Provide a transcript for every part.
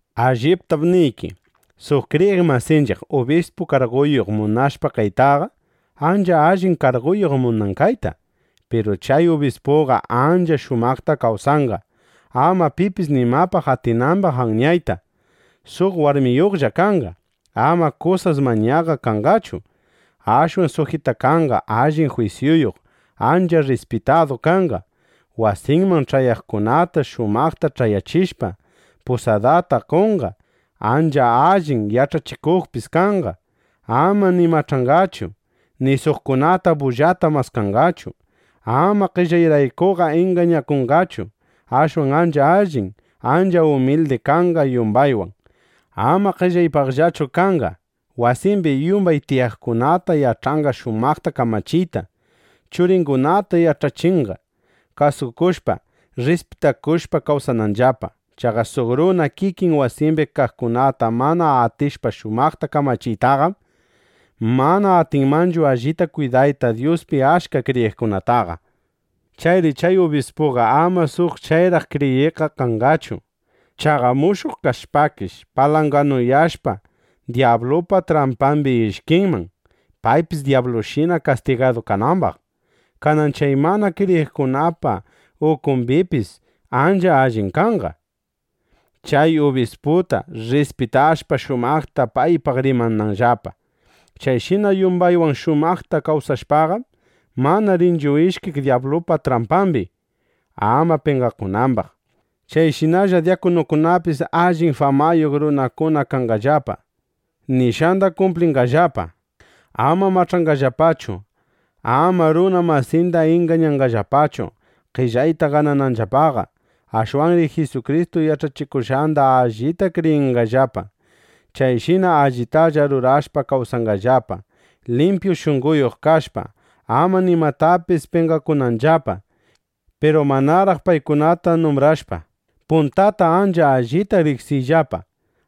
Alliptam niyki, suq kriyiq masinchiq ubispu karguyuq munashpa kaytaqa, ancha allin karguyuq munan kayta. Piru chay ubispuqa ancha shumaqta kawsanqa, ama pipis nimapaq atinambaq anyayta. Suq warmiyuqlla kanqa. Ama kusas mañaqa kanqachu; ashwan sujitakanqa. Allin jwisyuyuq, ancha rrispitadu kanqa. Wasinman ch'ayaqkunata shumaqta ch'ayachishpa, pusadata qonqa. Ancha allin yach'achikuqpis kanqa. Ama ni mach'anqachu, ni suqkunata bullata maskanqachu. Ama qellayraykuqa ingañakunqachu. Ashwan ancha allin, ancha umildi kanqa yumbaywan. Ama qellaypaqllachu kanqa. Wasimbi yumbay tiyaqkunata yach'anqa shumaqta kamachiyta. Churingunata yach'achinqa, kasukushpa, rrispitakushpa kawsananllapa. Chaqa suq runa kikin wasimbi kaqkunata mana atishpa shumaqta kamachiytaqam, mana atinmanchu allita kwidayta Dyuspi achka kriyiqkunataqa. Chayri chay ubispuqa ama suq chayraq kriyiqqa kanqachu. Chaqa mushuq kashpakish, palanganuyashpa, dyablupa trampambi ishkinman, paypis dyablushina kastigadu kanambaq. Kanan chay mana kriyiqkunapa ukumbipis ancha allin kanqa, chay ubisputa rrispitashpa, shumaqta paypaq rimananllapa. Chayshina yumbaywan shumaqta kawsashpaqam, mana rinchu ishkiq dyablupa trampambi, ama penqakunambaq. Chayshinalla dyakunukunapis allin famayuq runakuna kanqallapa. Nishqanda kumplinqallapa. Ama mach'anqallapachu. Ama runa masinda ingañanqallapachu, qellayta ganananllapaqa. Ashwanri Jisukristu yach'achikushqanda allita kriyinqallapa. Chayshina allitalla rurashpa kawsanqallapa, limpyu shunqoyuq kashpa, ama nimapaqpis penqakunanllapa. Piru manaraq paykunata numbrashpa, puntata ancha allita riqsiyllapa: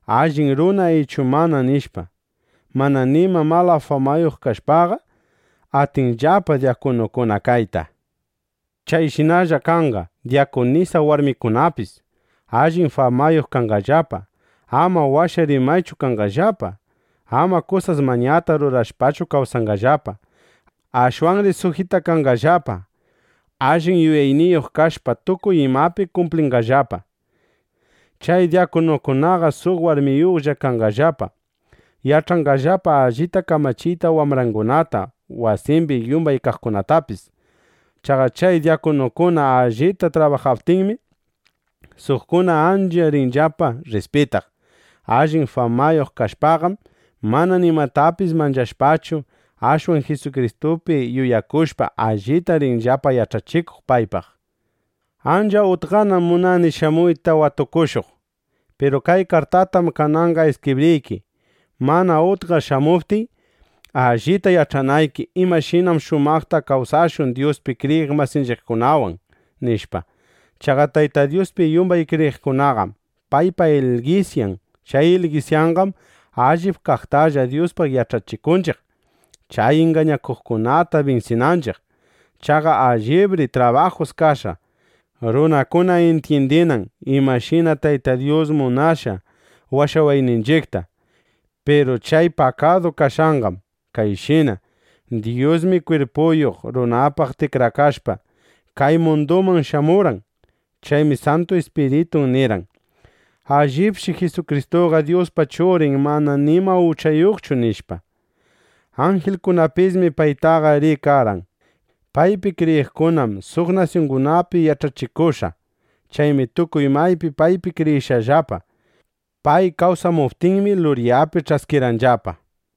Allin runa ichu mana, nishpa. Mana nima mala famayuq kashpaqa, atinllapa dyakunukuna kayta. Chayshinalla kanqa dyakunisa warmikunapis. Allin famayuq kanqallapa. Ama washa rimaykunachu kanqallapa. Ama kusas mañata rurashpachu kawsanqallapa; ashwanri sujitakanqallapa. Allin yuyayniyuq kashpa, tukuy imapi kumplinqallapa. Chay dyakunukunaqa suq warmiyuqlla kanqallapa. Yach'anqallapa allita kamachiyta wambrangunata, wasimbi yumbay kaqkunatapis. Chaqa chay dyakunukuna allita trabajaptinmi, suqkuna ancha rinllapa rrispitaq. Allin famayuq kashpaqam, mana nimatapis manchashpachu, ashwan Jisukristupi yuyakushpa, allita rinllapa yach'achikuq paypaq. Ancha utqanam munani shamuyta watukushuq. Piru kay kartatam kananqa iskibriyki, mana utqa shamuptiy, allita yach'anayki imashinam shumaqta kawsashun Dyuspi kriyiq masinchiqkunawan, nishpa. Chaqa Tayta Dyuspi yumbay kriyiqkunaqam paypa ilgisyan. Chay ilgisyanqam allip kaqtalla Dyuspaq yach'achikunchiq, chay ingañakuqkunata binsinanchiq. Chaqa allibri trabajus kashqa, runakuna intyindinan imashina Tayta Dyus munashqa washawayninchiqta. Piru chay pakadu kashqanqam kayshina: Dyusmi kwirpuyuq runapaq tikrakashpa, kay munduman shamurqan. Chaymi Santu Ispiritun nirqan: “Allipshi Jisukristuqa Dyuspa Churin mana nima uchayuqchu”, nishpa. Anjilkunapismi paytaqa rikarqan. Paypi kriyiqkunam suq nasyungunapi yach'achikushqa. Chaymi tukuy maypi paypi kriyishqallapa. Pay kawsamuptinmi, luryapi ch'askirqanllapa.